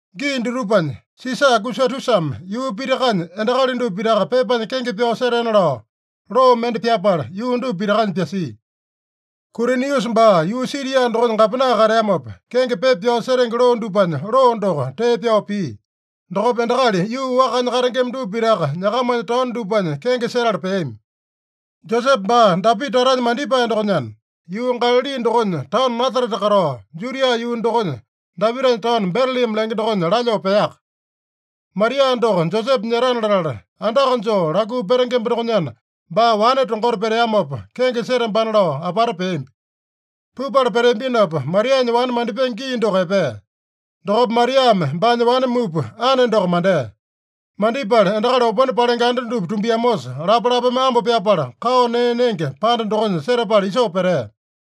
Gii dutupanya Sisa Agusatusame yuu pitakanya endakali dupa pitaka pepanya kenge pyao setena lao loo mende pyapala, yuu dupa pitakanya pyasia. Kuriniusa baa yuu Siria dokonya gapena kateamopa, kenge pepa pyao setenge loo dupanya, loo doko tee pyao pia. Dokopa endakali yuu wakanya katengema dupa pitaka nyakamanya taono dupanya kenge setala peami. Josepe baa Dapita tatanya mandipae dokonyana, yuu Galali dokonya taono Nasarete katao, Judia yuu dokonya Dapitanya taono Betelema lenge dokonya lalyoo peaka. Maria doko Josepe nyetana latala, andaka joo lakuu petengemba dokonyana, baa wane tongota peteamopa, kenge setambana lao apata peambi. Pupala peteambinopa, Marianya wane mandipenge gii doko epea. Dokopa Mariame baanya wane mupa, ane doko mandea. Mandipala endakali opone palenge anda dupa tumbiamosa, lapalapame ambo pyapala, kao nee nenge panda dokonya setapala isoo petea.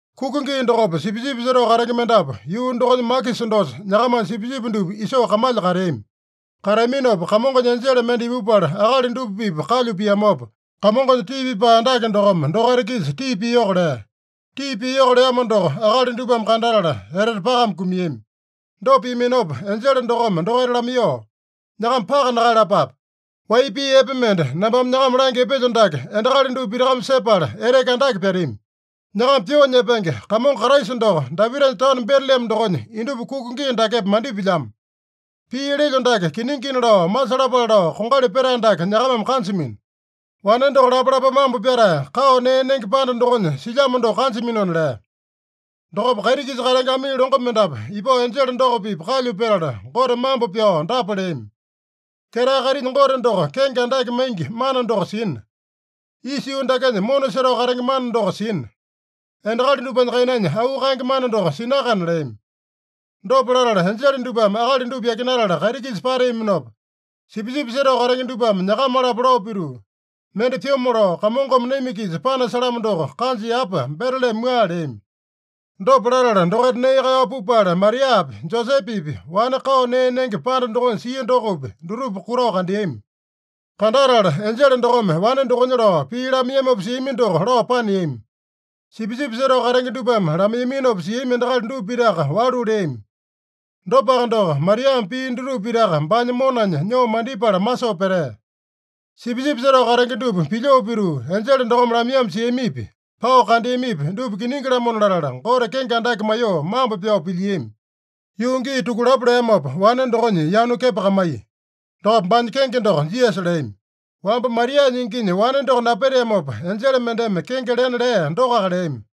Kuka gii dokopa sipisipi setao katenge mendapu yuu dokonya makisa dosa nyakamanya sipisipi dupa isoo kamalya kateami. Kateaminopa, Kamongonya enjele mende ipupala akali dupa-pipa kalyu piamopa, Kamongonya tii pipae andake dokome dokaita-kisa tii piyoko lea. Tii piyoko leamo doko akali dupame kandatala etete pakame kumiami. Dopa piaminopa enjele dokome dokaita lamaiyoo, “Nyakama paka nakaeyalapape. Wai pii epe mende nambame nyakama langya epelyo dake endakali dupa pitakame sepala eteke andake pyatami: Nyakama pyoo nyepenge Kamongo Kraisa doko Dapitanya taono Betelema dokonya indupa kuku gii dakepa mandipilyamo. Pii lelyo dake kiningina lao masalapale lao kongali petae dake nyakamame kanjamino: Wane doko lapalapame ambo pyatae, kao nee nenge panda dokonya silyamo doko kanjaminona” lea. Dokopa kaiti-kisa katenge amii longo mendapu ipao enjele doko-pipa kalyu petala, Gote mambo pyao dapa leami: “Ketae kaitinya Gote doko kenge andake maingi mana doko sina. Isa yuu dakenya mona setao katenge mana doko sina. Endakali dupanya kainanya auu kaenge mana doko sinakana” leami. Dopa latala enjele dupame akali dupa yakinatala kaiti-kisa pateaminopa, sipisipi setao katenge dupame nyakama-lapo lao pituu, “Mende pyomo lao Kamongome naima-kisa panasalamo doko kanja yapa Betelema mua” leami. Dopa latala dokaita nee kaeyao pupala, Mariapi, Josepepi, wane kao nee nenge panda dokonya sia dokopi, dutupa kutao kandeami. Kandatala enjele dokome wane dokonya lao pii lamaiyamopa siami doko lao paneami. Sipisipi setao katenge dupame lamaiyaminopa siami endakali dupa pitaka walu leami. Dopaka doko, Mariame pii dutupa pitaka baanya monanya nyoo mandipala masoo petea. Sipisipi setao katenge dupa pilyoo pituu, enjele dokome lamaiyamo siamipi, pao kandeamipi, dupa kiningi-lamona latala, Gote kenge andake maiyoo mambo pyao pilyiami. Yuu gii tukulapo leamopa, wane dokonya yanu kepakamaiya. Dokopa baanya kenge doko Jisasa leami. Wamba Marianya inginya wane doko napeteamopa, enjele mendeme kenge lena lea dokoaka leami.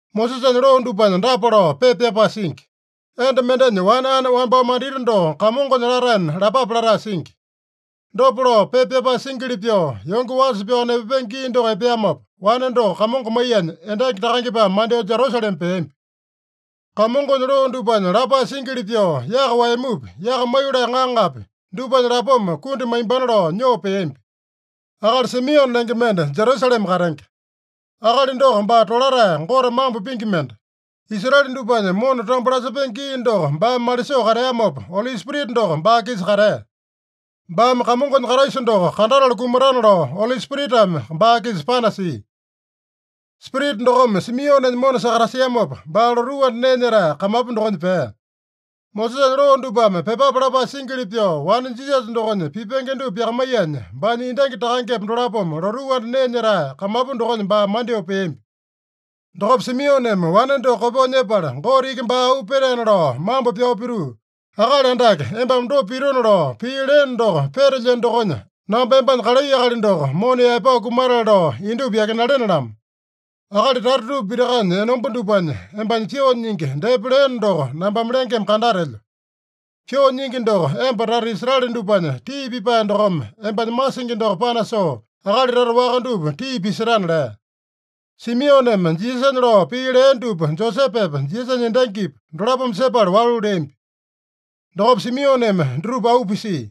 Mosesanya loo dupanya dapa lao pepa pyapae singi: “Enda mendenya wane ane wambao mandita doko Kamongonya lataena lapape” latae singi. Dopa lao pepa pyapae singili pyoo, yonge wasa pyao nepapenge gii doko epeamopa, wane doko Kamongo maiyanya endangi takangepame mandyoo Jerusalema peambi. Kamongonya loo dupanya lapae singili pyoo, yaka waeyamupi, yaka maiyolee ŋaŋapi, dupanya lapoma kundi maimbana lao nyoo peambi. Akali Simione lenge mende Jerusalema katenge. Akali doko baa tolatae, Gote mambo pingi mende. Israele dupanya mona tambo lasepenge gii doko baame malisoo kateamopa, Oli Spirita doko baa-kisa katea. Baame Kamongonya Kraisa doko kandatala kumatana lao Oli Spiritame baa-kisa panasia. Spirita dokome Simionenya mona sakatasiamopa, baa lotuu anda nee nyetae kamapu dokonya pea. Mosesanya loo dupame pyepape lapae singili pyoo wane Jisasa dokonya pipenge dupa pyakamaiyanya, baanya endangi takangepa dolapome lotuu anda nee nyetae kamapu dokonya baa mandyoo peambi. Dokopa Simioneme wane doko kopyoo nyepala, Gote iki baa auu petaena lao mambo pyao pituu, “Akali Andake, embame dopa pitona lao pii leeno doko petelyeno dokonya, namba embanya kalai akali doko mona yaepao kumatale lao indupa yakinalene-lamo. Akali tata dupa pitakanya enomba dupanya, embanya pyoo nyingi depa leeno doko nambame lengeme kandatelyo. Pyoo nyingi doko emba tata Israele dupanya tii pipae dokome, embanya masingi doko panasoo, akali tata waka dupa tii pisetana” lea. Simioneme Jisasanya lao pii lea dupa Josepepa, Jisasanya endangipa, dolapome sepala walu leambi. Dokopa Simioneme dutupa auu pisia.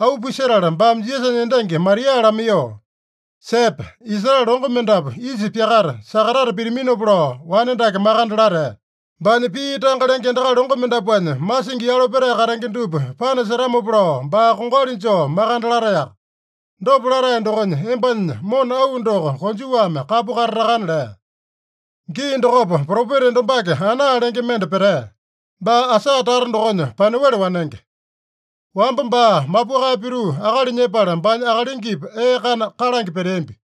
Auu pisetala baame Jisasanya endangi Maria lamaiyoo, “Sepe! Israele longo mendapu isa pyakata, sakatata pitaminopa lao wane dake makande latae. Baanya pii tanga lenge endakali longo mendapuanya masingi yalo petae katenge dupa panasetamopa lao, baa kongali joo makande lataeyaka. Dopa latae dokonya, embanya mona auwa doko konjuwame kapu katatakana” lea. Gii dokopa propeta enda wambake Ana lenge mende petea. Baa Asaa tata dokonya Panuele wanenge. Wamba baa mapukae pituu akali nyepala, baanya akalingipa ee kana kalange peteambi.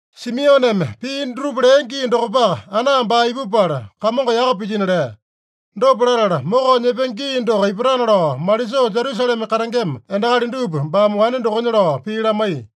Simioneme pii dutupa lea gii dokopaka, Ana baa ipupala, Kamongo yaka pilyino lea. Dopa latala, mokao nyepenge gii doko ipatana lao malisoo Jerusalema katengema endakali dupa baame wane dokonya lao pii lamaiya.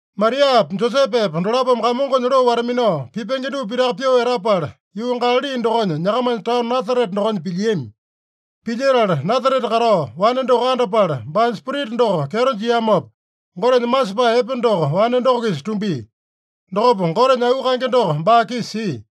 Mariapa Josepepa dolapome Kamongonya loo wata-minao pipenge dupa pitaka pyoo etapala, yuu Galali dokonya, nyakamanya taono Nasarete dokonya pilyiami. Pilyetala Nasarete katao, wane doko andapala, baanya spirita doko kyeto jiamopa, Gotenya masepae epe doko wane doko-kisa tumbia. Dokopa Gotenya auu kaenge doko baa-kisa sia.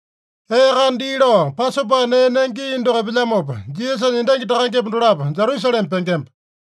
Ee kana dii lao, Pasopa nee nenge gii doko epelyamopa, Jisasanya endangi takangepa dolapo Jerusalema pengemba.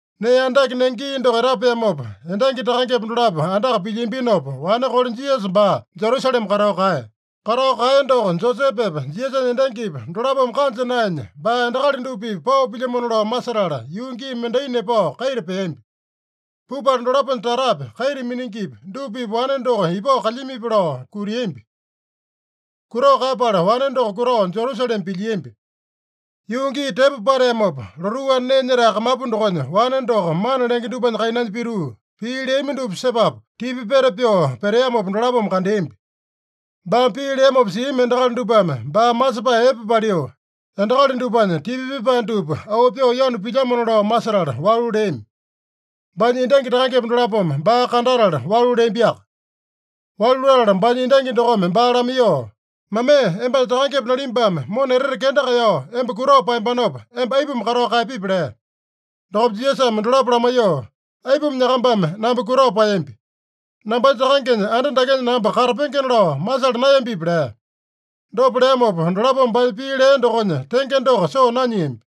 Nee andake nenge gii doko etapeamopa, endangi takangepa dolapo andaka pilyiambinopa, wane kole Jisasa baa Jerusalema katao kaeya. Katao kaeya doko Josepepa, Jisasanya endangipa dolapome kanja naenya, baa endakali dupa-pipa pao pilyamano lao masetala, yuu gii mendai nepao kaita peambi. Pupala dolaponya tatapi, kaita miningipi dupa-pipa wane doko ipao kalyamipi lao kutiambi. Kutao kaeyapala wane doko kutao Jerusalema pilyiambi. Yuu gii tepo pateamopa, lotuu anda nee nyetae kamapu dokonya wane doko mana lenge dupanya kainanya pituu, pii leami dupa sepapu, tipa peta pyoo peteamopa dolapome kandeambi. Baame pii leamopa siami endakali dupame baa masepae epe paliu, endakali dupanya tipa pipae dupa auu pyoo yanu pilyamona lao masetala walu leami. Baanya endangi takangepa dolapome baa kandatala walu leambiaka. Walu latala baanya endangi dokome baa lamaiyoo, “Mamee, embanya takangepa nalimbame mona etete kenda kaeyao emba kutao paeyambanopa, emba aipuma katao kaeyapipi?” lea. Dokopa Jisasame dolapo lamaiyoo, “Aipuma nyakambame namba kutao paeyambi? Nambanya Takangenya anda dakenya namba katapengena lao masala naeyambipi?” lea. Dopa leamopa, dolapome baanya pii lea dokonya tenge doko soo nanyiambi.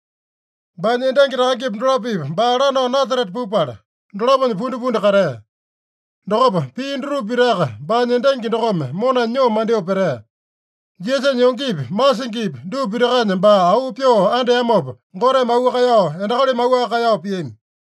Baanya endangi takangepa dolapo-pipa baa lanao Nasarete pupala, dolaponya pundipundi katea. Dokopa pia dutupa pitaka baanya endangi dokome monanya nyoo mandyoo petea. Jisasanya yongepi, masingipi dupa pitakanya baa auu pyoo andeamopa, Goteme auu kaeyao, endakalimi auwaka kaeyao piami.